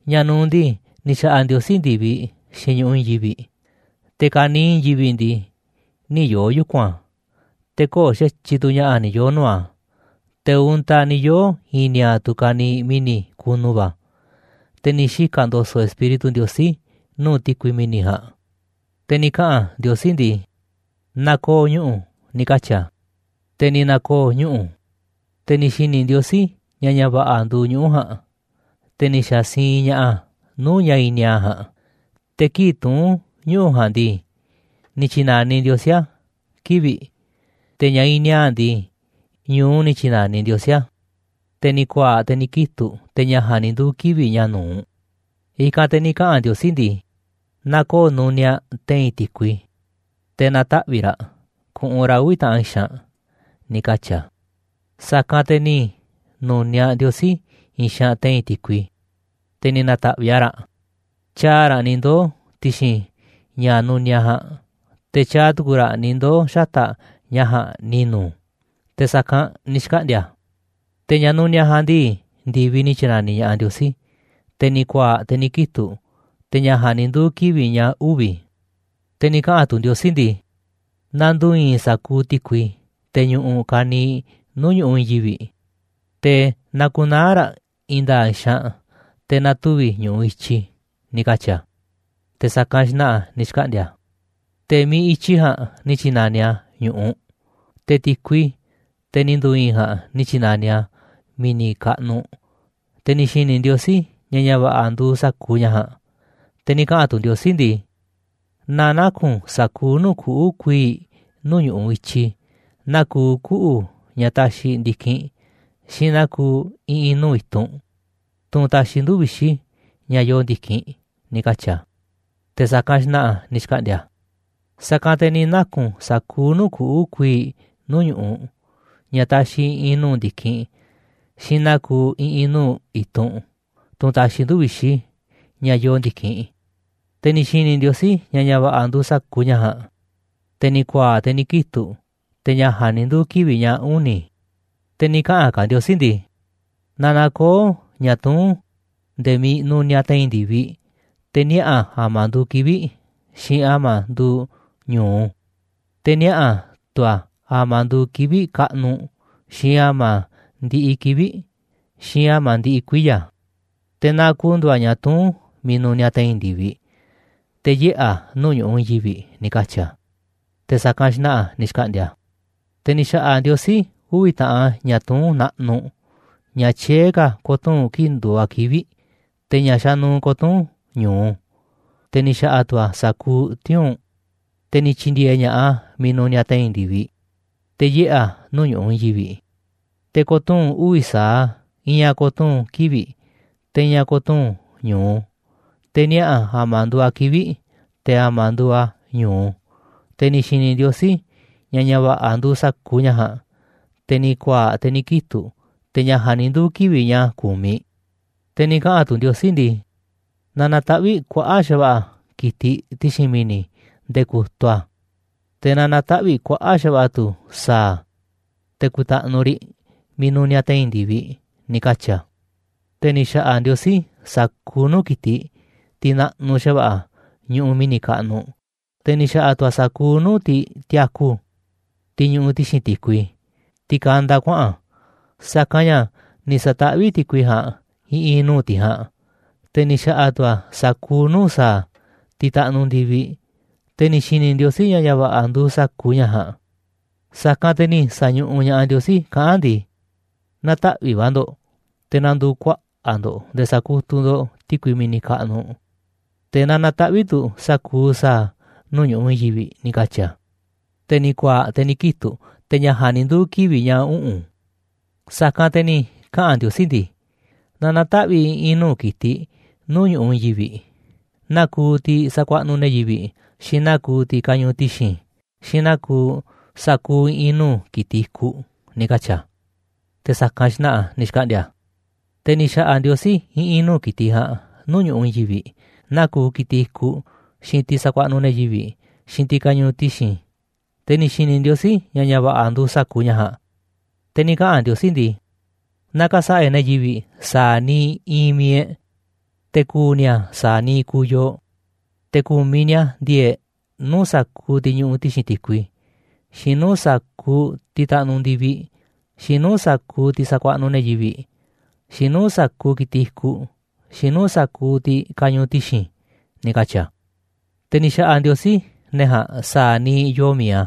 Ña̱ nu̱uꞌ ndii, ni̱ xa̱ꞌa̱ Ndiosí ndi̱viꞌ, xiinꞌ ñu̱ꞌuꞌ i̱i̱n yivi̱ꞌ. Te̱ ka̱niiꞌ i̱i̱n yivi̱ꞌ ndii, nï̱ yoo̱ yuku̱n a̱, te̱ köo̱ꞌ xa̱tyiꞌ tu̱ ña̱ꞌa̱ ni̱ yoo̱ nuu̱ꞌ a̱, te̱ untaꞌ ni̱ yoo̱ i̱i̱n ni̱a̱a̱ꞌ tu̱ ka̱niiꞌ mi̱ni̱ kunu va̱. Te̱ ni̱ xika̱ ndo̱so̱ꞌ Espíritu Ndiosí nuu̱ꞌ ti̱kui mi̱ni̱ ja̱a̱nꞌ. Te̱ ni̱ kaꞌa̱n Ndiosí ndii: ―Na ko̱o̱ ñuꞌu̱ ―ni̱ katyi̱ a̱. Te̱ ni̱ na̱koo̱ ñuꞌu̱. Te̱ ni̱ xi̱ni̱ Ndiosí ña̱ ña̱ va̱ꞌa̱ nduuꞌ ñuꞌu̱ ja̱a̱nꞌ, te̱ ni̱ xa̱ siinꞌ ña̱ꞌaꞌ a̱ nuu̱ꞌ ña̱ i̱i̱n ni̱a̱a̱ꞌ ja̱a̱nꞌ. Te̱ kii̱ꞌ tuún ñuꞌu̱ ja̱a̱nꞌ ndii, ni̱ tyi̱na̱niꞌ Ndiosí a̱ kivi̱ꞌ. Te̱ ña̱ iinꞌ ni̱a̱a̱ꞌ ndii, ñu̱u ni̱ tyi̱na̱niꞌ Ndiosí a̱. Te̱ ni̱ ku̱a̱a̱ꞌ, te̱ ni̱ kitu̱ꞌ, te̱ ña̱ ja̱a̱nꞌ ni̱ nduu̱ kivi̱ꞌ ña̱ nu̱uꞌ. I̱kanꞌ te̱ ni̱ kaꞌa̱n Ndiosí ndii: ―Na ko̱o̱ nuniaꞌ te̱i̱n ti̱kui, te̱ na̱taꞌvi̱ꞌ raꞌ ku̱ꞌu̱n raꞌ uvi̱ taꞌan xaanꞌ ―ni̱ katyi̱ a̱. Sa̱kanꞌ te̱ ni̱ nu̱niaꞌ Ndiosí i̱i̱n xaanꞌ te̱i̱n ti̱kui, te̱ ni̱ na̱ta̱ꞌviꞌ a̱ raꞌ, tyaaꞌ raꞌ ni̱ ndoo̱ ti̱xi̱n ña̱ nuniaꞌ ja̱a̱nꞌ, te̱ tyaaꞌ tu̱ku̱ raꞌ ni̱ ndoo̱ xata̱ꞌ ña̱ ja̱a̱nꞌ ni̱nu̱. Te̱ sa̱kanꞌ ni̱ xkaꞌndi̱a̱ a̱. Te̱ ña̱ nuniaꞌ ja̱a̱nꞌ ndii, ndi̱viꞌ ni̱ tyi̱na̱niꞌ ña̱ꞌaꞌ Ndiosí. Te̱ ni̱ ku̱a̱a̱ꞌ, te̱ ni̱ kitu̱ꞌ, te̱ ña̱ ja̱a̱nꞌ ni̱ nduu̱ kivi̱ꞌ ña̱ uvi̱. Te̱ ni̱ kaꞌa̱n tu̱ Ndiosí ndii: ―Na ndu̱u̱ i̱i̱n sa̱kuuꞌ ti̱kui, te̱ ñuꞌuꞌ ka̱niiꞌ nuu̱ꞌ ñu̱ꞌuꞌ i̱i̱n yivi̱ꞌ, te̱ na̱ku̱naa̱ raꞌ i̱i̱n nda̱a̱ꞌ xaanꞌ te̱ na̱tuvi̱ ñu̱ꞌuꞌ i̱tyi ―ni̱ katyi̱ a̱. Te̱ sa̱kanꞌ xna̱ꞌa̱ ni̱ xkaꞌndi̱a̱ a̱. Te̱ miiꞌ i̱tyi ja̱a̱nꞌ ni̱ tyi̱na̱niꞌ a̱ ñu̱ꞌuꞌ, te̱ ti̱kui, teꞌ ni̱ ndu̱u̱ i̱i̱n ja̱a̱nꞌ, ni̱ tyi̱na̱niꞌ a̱ mi̱ni̱ kaꞌnuꞌ. Te̱ ni̱ xi̱ni̱ Ndiosí ña̱ ña̱ va̱ꞌa̱ nduuꞌ sa̱kuuꞌ ña̱ ja̱a̱nꞌ. Te̱ ni̱ kaꞌa̱n tu̱ Ndiosí ndii: ―Na naku̱n sa̱kuuꞌ nuu̱ꞌ kuꞌu̱ kuii̱ꞌ nuu̱ꞌ ñu̱ꞌuꞌ i̱tyi, naa kuuꞌ kuꞌu̱ ña̱ taxiꞌ ndi̱kinꞌ, xiinꞌ naa kuuꞌ i̱ꞌi̱n nuu̱ꞌ i̱tunꞌ, tunꞌ taxiꞌ nduu̱ꞌ vixi̱, ña̱ yoo ndi̱kinꞌ ―ni̱ katyi̱ a̱. Te̱ sa̱kanꞌ xna̱ꞌa̱ ni̱ xkaꞌndi̱a̱ a̱. Sa̱kanꞌ te̱ ni̱ naku̱n sa̱kuuꞌ nuu̱ꞌ kuꞌu̱ kuii̱ꞌ nuu̱ꞌ ñu̱ꞌuꞌ, ña̱ taxiꞌ i̱ꞌi̱n nuu̱ꞌ ndi̱kinꞌ xiinꞌ naa kuuꞌ i̱ꞌi̱n nuu̱ꞌ i̱tunꞌ, tunꞌ taxiꞌ nduu̱ꞌ vixi̱, ña̱ yoo ndi̱kinꞌ. Te̱ ni̱ xi̱ni̱ Ndiosí ña̱ ña̱ va̱ꞌa̱ nduuꞌ sa̱kuuꞌ ña̱ ja̱a̱nꞌ. Te̱ ni̱ ku̱a̱a̱ꞌ, te̱ ni̱ kitu̱ꞌ, te̱ ña̱ ja̱a̱nꞌ ni̱ nduu̱ kivi̱ꞌ ña̱ uni̱. Te̱ ni̱ kaꞌa̱n ka̱ Ndiosí ndii: ―Na na̱koo̱ ña̱ tuún nde̱e̱ miiꞌ nuniaꞌ te̱i̱n ndi̱viꞌ te̱ niaꞌa̱ a̱ a̱ma̱ nduuꞌ kivi̱ꞌ, xiinꞌ a̱ma̱ nduuꞌ ñu̱u, te̱ niaꞌa̱ tu̱ a̱ a̱ma̱ nduuꞌ kivi̱ꞌ kaꞌnuꞌ, xiinꞌ a̱ma̱ ndiꞌiꞌ kivi̱ꞌ, xiinꞌ a̱ma̱ ndiꞌiꞌ kuiya̱. Te̱ na ku̱ndu̱u̱ a̱ ña̱ tuún miiꞌ nuniaꞌ te̱i̱n ndi̱viꞌ, te̱ yiꞌe̱ a̱ nuu̱ꞌ ñu̱ꞌuꞌ i̱i̱n yivi̱ꞌ ―ni̱ katyi̱ a̱. Te̱ sa̱kanꞌ xna̱ꞌa̱ ni̱ xkaꞌndi̱a̱ a̱. Te̱ ni̱ xa̱ꞌa̱ Ndiosí uvi̱ taꞌan ña̱ tuún naꞌnuꞌ. Ña̱ tyié ka̱ ko̱tuu̱n kii̱ꞌ nduuꞌ a̱ kivi̱ꞌ, te̱ ña̱ xanuuꞌ ko̱tuu̱n ñu̱u, te̱ ni̱ xa̱ꞌa̱ tu̱ a̱ sa̱kuuꞌ tiuu̱nꞌ. Te̱ ni̱ tyi̱ndi̱e̱e̱ ña̱ꞌaꞌ a̱ miiꞌ nuniaꞌ te̱i̱n ndi̱viꞌ, te̱ yiꞌe̱ a̱ nuu̱ꞌ ñu̱ꞌuꞌ i̱i̱n yivi̱ꞌ, te̱ ko̱tuu̱n uvi̱ sa̱aꞌ a̱, i̱i̱n a̱ ko̱tuu̱n kivi̱ꞌ, te̱ i̱i̱n a̱ ko̱tuu̱n ñu̱u, te̱ niaꞌa̱ a̱ a̱ma̱ nduuꞌ a̱ kivi̱ꞌ, te̱ a̱ma̱ nduuꞌ a̱ ñu̱u. Te̱ ni̱ xi̱ni̱ Ndiosí ña̱ ña̱ va̱ꞌa̱ nduuꞌ sa̱kuuꞌ ña̱ ja̱a̱nꞌ. Te̱ ni̱ ku̱a̱a̱ꞌ, te̱ ni̱ kitu̱ꞌ, te̱ ña̱ ja̱a̱nꞌ ni̱ nduu̱ kivi̱ꞌ ña̱ ku̱miꞌ. Te̱ ni̱ kaꞌa̱n tu̱ Ndiosí ndii: ―Na na̱taꞌvi̱ꞌ kuaꞌa̱ꞌ xa̱va̱ꞌa̱ ki̱tiꞌ ti̱xi̱n mi̱ni̱ nde̱e̱ ku̱tuꞌ a̱. Te̱ na na̱taꞌvi̱ꞌ kuaꞌa̱ꞌ xa̱va̱ꞌa̱ tu̱ sa̱a̱, te̱ ku̱i̱ta̱ꞌnu̱ riꞌ miiꞌ nuniaꞌ te̱i̱n ndi̱viꞌ ―ni̱ katyi̱ a̱. Te̱ ni̱ xa̱ꞌa̱ Ndiosí sa̱kuuꞌ nuu̱ꞌ ki̱tiꞌ, tiꞌ naꞌnuꞌ xa̱va̱ꞌa̱ ñuꞌuꞌ mi̱ni̱ kaꞌnuꞌ, te̱ ni̱ xa̱ꞌa̱ tu̱ a̱ sa̱kuuꞌ nuu̱ꞌ tiꞌ tiaku, tiꞌ ñuꞌuꞌ ti̱xi̱n ti̱kui, tiꞌ kanda kuaꞌa̱n, sa̱kanꞌ ña̱ ni̱ sa̱taꞌvíꞌ ti̱kui ja̱a̱nꞌ i̱ꞌi̱n nuu̱ꞌ tiꞌ ja̱a̱nꞌ. Te̱ ni̱ xa̱ꞌa̱ tu̱ a̱ sa̱kuuꞌ nuu̱ꞌ sa̱a̱, tiꞌ taꞌnuꞌ ndi̱viꞌ. Te̱ ni̱ xi̱ni̱ Ndiosí ña̱ ña̱ va̱ꞌa̱ nduuꞌ sa̱kuuꞌ ña̱ ja̱a̱nꞌ. Sa̱kanꞌ te̱ ni̱ sa̱ñuꞌuꞌ ña̱ꞌaꞌ Ndiosí kaꞌán a̱ ndii: ―Na̱taꞌvi̱ꞌ va̱ ndo̱ꞌ te̱ na̱ndu̱u̱ kuaꞌa̱ꞌ ndo̱ꞌ nde̱e̱ sa̱kutuꞌ ndo̱ꞌ ti̱kui mi̱ni̱ kaꞌnuꞌ. Te̱ na na̱taꞌvi̱ꞌ tu̱ sa̱kuuꞌ sa̱a̱ nuu̱ꞌ ñu̱ꞌuꞌ i̱i̱n yivi̱ꞌ ―ni̱ katyi̱ a̱. Te̱ ni̱ ku̱a̱a̱ꞌ, te̱ ni̱ kitu̱ꞌ, te̱ ña̱ ja̱a̱nꞌ ni̱ nduu̱ kivi̱ꞌ ña̱ uꞌu̱n. Sa̱kanꞌ te̱ ni̱ kaꞌa̱n Ndiosí ndii: ―Na na̱taꞌvi̱ꞌ i̱ꞌi̱n nuu̱ꞌ ki̱tiꞌ nuu̱ꞌ ñu̱ꞌuꞌ i̱i̱n yivi̱ꞌ: Naa kuuꞌ tiꞌ sakuaꞌnuꞌ ne̱ yivi̱ꞌ, xiinꞌ naa kuuꞌ tiꞌ kañuuꞌ ti̱xi̱n, xiinꞌ naa kuuꞌ sa̱kuuꞌ i̱ꞌi̱n nuu̱ꞌ ki̱tiꞌ i̱kuꞌ ―ni̱ katyi̱ a̱. Te̱ sa̱kanꞌ xna̱ꞌa̱ ni̱ xkaꞌndi̱a̱ a̱. Te̱ ni̱ xa̱ꞌa̱ Ndiosí i̱ꞌi̱n nuu̱ꞌ ki̱tiꞌ ja̱a̱nꞌ nuu̱ꞌ ñu̱ꞌuꞌ i̱i̱n yivi̱ꞌ, naa kuuꞌ ki̱tiꞌ i̱kuꞌ, xiinꞌ tiꞌ sakuaꞌnuꞌ ne̱ yivi̱ꞌ, xiinꞌ tiꞌ kañuuꞌ ti̱xi̱n. Te̱ ni̱ xi̱ni̱ Ndiosí, ña̱ ña̱ va̱ꞌa̱ nduuꞌ sa̱kuuꞌ ña̱ ja̱a̱nꞌ. Te̱ ni̱ kaꞌa̱n Ndiosí ndii: ―Na ka̱sa̱ꞌa̱ e̱ꞌ ne̱ yivi̱ꞌ sa̱a̱ niiꞌ iinꞌ mi̱iꞌ e̱ꞌ, te̱ ku̱u̱ ni̱a̱ sa̱a̱ niiꞌ kuuꞌ yooꞌ, te̱ ku̱miꞌ ni̱a̱ ndi̱e̱e̱ꞌ nuu̱ꞌ sa̱kuuꞌ tiꞌ ñuꞌuꞌ ti̱xi̱n ti̱kui, xiinꞌ nuu̱ꞌ sa̱kuuꞌ tiꞌ taꞌnuꞌ ndi̱viꞌ, xiinꞌ nuu̱ꞌ sa̱kuuꞌ tiꞌ sakuaꞌnuꞌ ne̱ yivi̱ꞌ, xiinꞌ nuu̱ꞌ sa̱kuuꞌ ki̱tiꞌ i̱kuꞌ, xiinꞌ nuu̱ꞌ sa̱kuuꞌ tiꞌ kañuuꞌ ti̱xi̱n ―ni̱ katyi̱ a̱. Te̱ ni̱ xa̱ꞌa̱ Ndiosí ne̱ ja̱a̱nꞌ sa̱a̱ niiꞌ yoo mi̱iꞌ a̱,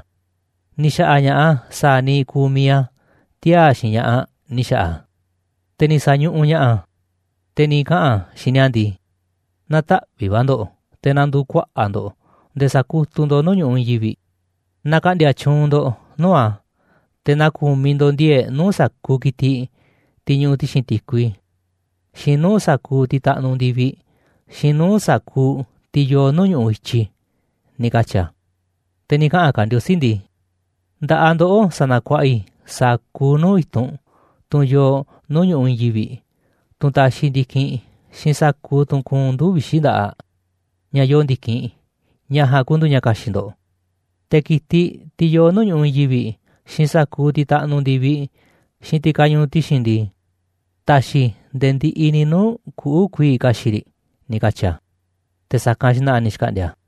ni̱ xa̱ꞌa̱ ña̱ꞌaꞌ a̱ sa̱a̱ niiꞌ kuuꞌ mi̱iꞌ a̱, tiaa̱ xiinꞌ ña̱ꞌaꞌ ni̱ xa̱ꞌa̱ a̱. Te̱ ni̱ sa̱ñuꞌuꞌ ña̱ꞌaꞌ a̱, te̱ ni̱ kaꞌa̱n a̱ xiinꞌ ni̱a̱ ndii: ―Na̱taꞌvi̱ꞌ va̱ ndo̱ꞌ, te̱ na̱ndu̱u̱ kuaꞌa̱ꞌ ndo̱ꞌ nde̱e̱ sa̱kutuꞌ ndo̱ꞌ nuu̱ꞌ ñu̱ꞌuꞌ i̱i̱n yivi̱ꞌ, na ka̱ꞌndi̱a̱ tyuunꞌ ndo̱ꞌ nuu̱ꞌ a̱. Te̱ na ku̱miꞌ ndo̱ꞌ ndi̱e̱e̱ꞌ nuu̱ꞌ sa̱kuuꞌ ki̱tiꞌ, tiꞌ ñuꞌuꞌ ti̱xi̱n ti̱kui, xiinꞌ nuu̱ꞌ sa̱kuuꞌ tiꞌ taꞌnuꞌ ndi̱viꞌ, xiinꞌ nuu̱ꞌ sa̱kuuꞌ tiꞌ yoo nuu̱ꞌ ñu̱ꞌuꞌ i̱tyi ―ni̱ katyi̱ a̱. Te̱ ni̱ kaꞌa̱n ka̱ Ndiosí ndii: ―Nda̱ꞌaꞌ ndoꞌó sanakuaꞌa i̱ sa̱kuuꞌ nuu̱ꞌ i̱tunꞌ, tunꞌ yoo nuu̱ꞌ ñu̱ꞌuꞌ i̱i̱n yivi̱ꞌ, tunꞌ taxiꞌ ndi̱kinꞌ, xiinꞌ sa̱kuuꞌ tunꞌ kuunꞌ nduu̱ꞌ vixi̱ nda̱ꞌaꞌ, ña̱ yoo ndi̱kinꞌ. Ña̱ ja̱a̱nꞌ ku̱ndu̱u̱ ña̱ ka̱xi̱ꞌ ndo̱ꞌ. Te̱ ki̱tiꞌ, tiꞌ yoo nuu̱ꞌ ñu̱ꞌuꞌ i̱i̱n yivi̱ꞌ, xiinꞌ sa̱kuuꞌ tiꞌ taꞌnuꞌ ndi̱viꞌ, xiinꞌ tiꞌ kañuuꞌ ti̱xi̱n ndii, taxiꞌ i̱ nde̱e̱ ndiꞌiꞌ ni̱ nuu̱ꞌ kuꞌu̱ kuii̱ꞌ ka̱xi̱ꞌ riꞌ ―ni̱ katyi̱ a̱. Te̱ sa̱kanꞌ xna̱ꞌa̱ ni̱ xkaꞌndi̱a̱ a̱.